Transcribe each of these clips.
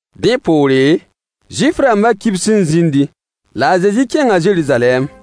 Dẽ poore, Zuif-rãmbã kibs n zĩndi, la a Zezi kẽnga Zeruzalɛm.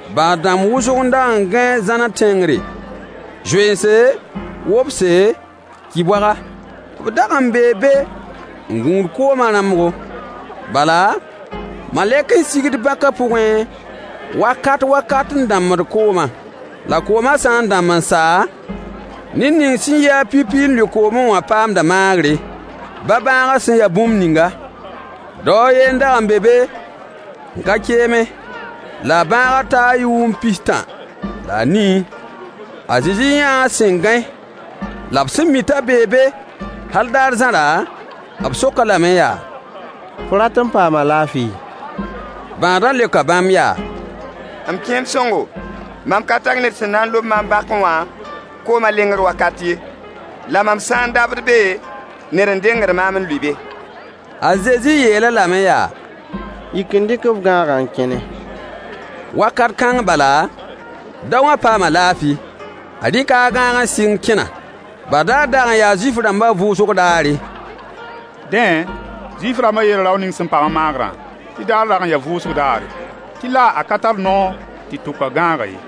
Bãad-dãmb wʋsg n dag n gãe zãnã tẽngre: zoense, wobse, ki-boaga. [B dag n bee be n gũud koomã rãmbgo. Bala, malɛk n sigd bãkã pʋgẽ wakat wakat n dãmbd koomã. La koomã sã n dãmb n sa, ned ning sẽn yɩ-a pipi n lʋɩ koomẽ wã paamda maagre, baa bãagã sẽn ya bũmb ninga.] Dao a yen n dag n be be n ka keemẽ, la a bãagã taa yʋʋm pis-tã la a nii. A Zezi yãa a sẽn gãe, la b sẽn mi t'a bee be hal daar zãrã, b sok-a lame yaa: Fo rat n paama laafɩ? Bãadã leoka bãmb yaa: M kẽem sõngo, mam ka tar ned sẽn na n lob maam bãkẽ wã koomã lengr wakat ye. La mam sã n dabd be, ned n dengd maam n lʋɩ be. A Zezi yeel-a lame yaa: Yik n dɩk f gãagã n kẽne. Wakat kãng bala, daowã paama laafɩ. A rɩka a gãag n sɩng kẽna. Badaar dag n yaa Zuif-rãmbã vʋʋsg daare. Dẽ, Zuif-rãmbã yeela rao ning sẽn paam-a maagrã tɩ daarã dag n yaa vʋʋsg daare, tɩ la a ka tar noor tɩ tʋk a gãagã ye.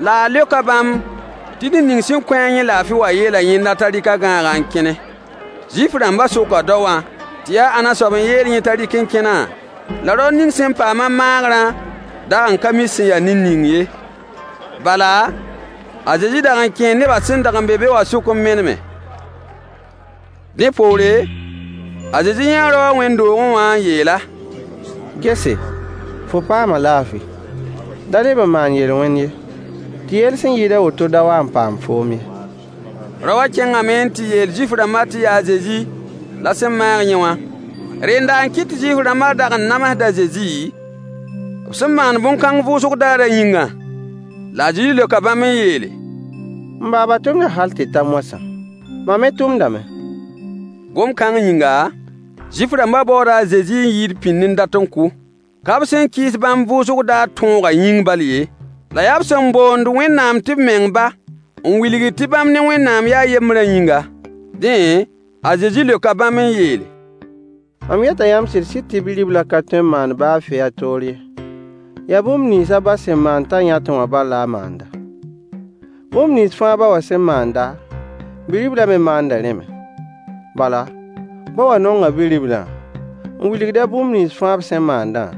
La a leoka bãmb tɩ ned ning sẽn kõ-a yẽ laafɩ wã yeela yẽnda t'a rɩk a gãagã n kẽne. Zuif-rãmbã soka daowã tɩ yaa ãnna soab n yeel yẽ t'a rɩk n kẽna? La rao ning sẽn paam-a maagrã dag n ka mi sẽn ya ned ning ye, bala, a Zezi dag n kẽe nebã sẽn dag n be be wã sʋk n meneme. Dẽ poore, a Zezi yãa rao wã wẽnd-doogẽ wã n yeel-a: Gese, fo paama laafɩ. Da leb n maan yel-wẽn ye, tɩ yell sẽn yɩɩd a woto da wa n paam foom ye. Rao wã kẽngame n tɩ yeel Zuif-rãmbã tɩ yaa a Zezi la sẽn maag yẽ wã. Rẽnda n kɩt tɩ Zuif-rãmbã dag n namsd a Zezi, b sẽn maand bõn-kãng vʋʋsg daarã yĩngã. La a Zezi leoka bãmb n yeele: M baaba tʋmda hal tɩ ta moasã. Mam me tʋmdame. Gom-kãng yĩnga, Zuif-rãmbã baooda a Zezi n yɩɩd pĩnd n dat n kʋ. Ka b sẽn kɩɩs bãmb vʋʋsg daar tõogã yĩng bal ye, la yaa b sẽn boond Wẽnnaam tɩ b meng ba, n wilgd tɩ bãmb ne Wẽnnaam yaa yembrã yĩnga. Dẽ, a Zezi leoka bãmb n yeele: Mam yeta yãmb sɩd-sɩd tɩ Bi-riblã ka tõe n maan baa fɩ a toor ye, yaa bũmb nins a ba sẽn maand t'a yãtẽ wã bal la a maanda. Bũmb nins fãa ba wã sẽn maanda, Bi-riblã me maanda rẽ me. Bala, ba wã nonga Bi-riblã, n wilgd-a bũmb nins fãa b sẽn maandã,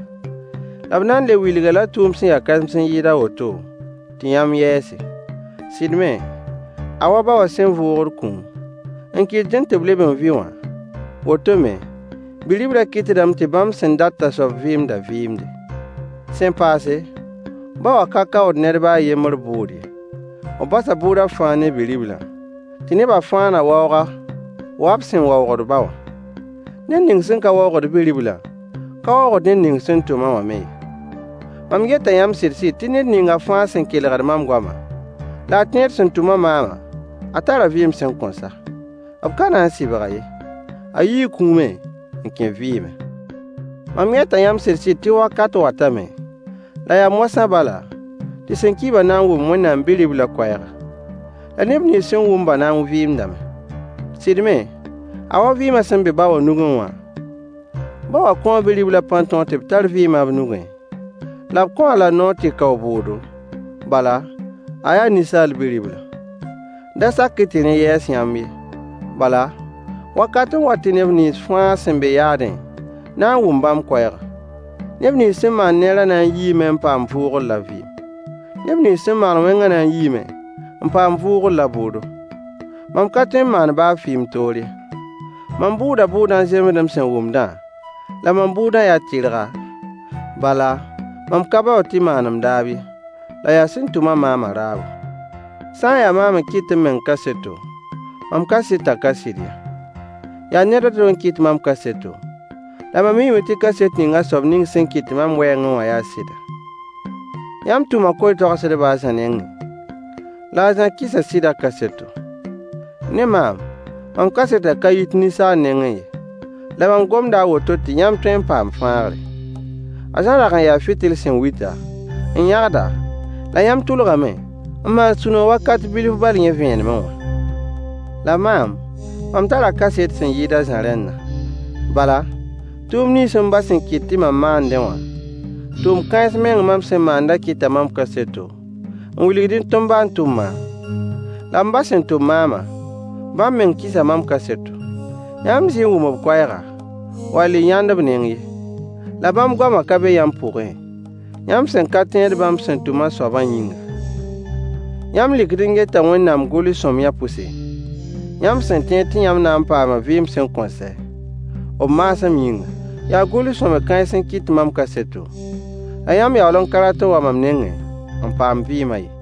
la b na n le wilg-a-la tʋʋm sẽn ya kãsems n yɩɩd a woto, tɩ yãmb yɛɛse. Sɩd me, a wa ba wã sẽn vʋʋgd kũum, n kɩtdẽ tɩ b leb n vɩ wã, woto me, Bi-riblã kɩtdame tɩ bãmb sẽn dat t'a soab vɩɩmdã vɩɩmde. Sẽn paase, ba wã ka kaood ned baa a yembr bʋʋd ye, b basa bʋʋdã fãa ne Bi-riblã, tɩ neba fãa na waoog-a wa b sẽn waoogd ba wã. Ned ning sẽn ka waoogd Bi-riblã ka waoogd ned ning sẽn tʋm-a wã me ye. Mam yeta yãmb sɩd-sɩd tɩ ned ning fãa sẽn kelgd mam goama, la a tẽed sẽn tʋm-a maamã a tara vɩɩm sẽn kõn sa. B ka na n sɩbg-a ye. A yii kũumẽ n kẽ vɩɩmẽ. Mam yeta yãmb sɩd-sɩd tɩ wakat watame — la yaa moasã bala — tɩ sẽn ki-bã na n wʋm Wẽnnaam Bi-riblã koɛɛga. La neb nins sẽn wʋm-bã na n vɩɩmdame. Sɩd me, a wa vɩɩmã sẽn be ba wã nugẽ wã, ba wã kõo Bi-riblã pãn-tõog tɩ b tar vɩɩmã b nugẽ, la b kõ-a-la noor tɩ kao bʋʋdo, bala, a yaa Ninsaal Bi-ribla. Da sak-y tɩ rẽ yɛɛs yãmb ye, bala, wakat n wat tɩ neb nins fãa sẽn be yaadẽ na n wʋm bãmb koɛɛga. Neb nins sẽn maan neerã na n yiime n paam vʋʋgr la vɩɩm. Neb nins sẽn maan wẽngã na n yiime n paam vʋʋgr la bʋʋdo. Mam ka tõe n maan baa fɩ m toor ye. Mam bʋʋda bʋʋdã n zemsed m sẽn wʋmdã, la mam bʋʋdã yaa tɩrga, bala, mam ka baood tɩ maan m daab ye, la yaa sẽn tʋm-a maamã raabo. Sã n yaa maam n kɩt m meng kaseto, mam kasetã ka sɩd ye. Yaa ned a to n kɩt mam kaseto, la mam miime tɩ kaset ning a soab sẽn kɩt mam wɛɛngẽ wã yaa sɩda. Yãmb tʋma koe-toagsedb a Zã nengẽ, la a Zã kɩsa sɩdã kaseto. Ne maam, mam kasetã ka yit ninsaal nengẽ ye, la mam gomda a woto tɩ yãmb tõe n paam fãagre. A Zã dag n yaa fɩtl sẽn wita, n yãgda, la yãmb tʋlgame n maan sũ-noog wakat bilf bal yẽ vẽenemẽ wã. La maam, mam tara kaset sẽn yɩɩd a Zã rẽndã. Bala, tʋʋm nins m ba sẽn kɩt tɩ mam maandẽ wã, tʋʋm kãens meng mam sẽn maandã kɩta mam kaseto, n wilgdẽ tɩ m ba n tʋm maam. La m ba sẽn tʋm maamã, bãmb meng kɩsa mam kaseto. Yãmb zɩ n wʋm b koɛɛga, wall y yãnd b neng ye, la bãmb goamã ka be yãmb pʋgẽ, yãmb sẽn ka tẽed bãmb sẽn tʋm a soabã yĩnga. Yãmb lɩkd n geta Wẽnnaam gʋls-sõamyã pʋse, yãmb sẽn tẽed tɩ yãmb na n paama vɩɩm sẽn kõn sɛ, b maasem yĩngã. Yaa gʋls-sõamy kãens n kɩt mam kaseto. La yãmb yaool n ka rat n wa mam nengẽ n paam vɩɩmã ye.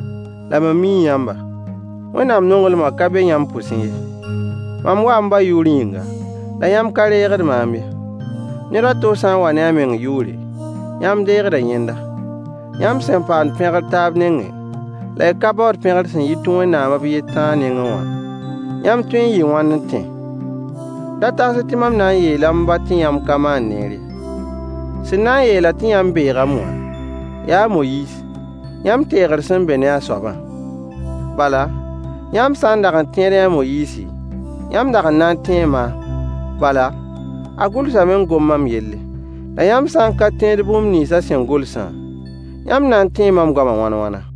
La mam mii yãmba: Wẽnnaam nonglmã ka be yãmb pʋsẽ ye. Mam waa m ba yʋʋr yĩnga, la yãmb ka reegd maam ye. Ned a to sã n wa ne a meng yʋʋre, yãmb deegda yẽnda. Yãmb sẽn paamd pẽgr taab nengẽ, la y ka baood pẽgr sẽn yit Wẽnnaam b yen tãa nengẽ wã, yãmb tõee n yɩɩ wãn n tẽ? Da tags-y tɩ mam na n yeela m ba tɩ yãmb ka maan neer ye. Sẽn na n yeel-a tɩ yãmb beegame wã, yaa a Moyiis, yãmb teegr sẽn be ne a soabã. Bala, yãmb sã n dag n tẽedẽ a Moyiisi, yãmb dag n na tẽ maam, bala, a gʋlsame n gom mam yelle. La yãmb sã n ka tẽed bũmb nins a sẽn gʋlsã, yãmb na n tẽe mam goama wãn-wãna?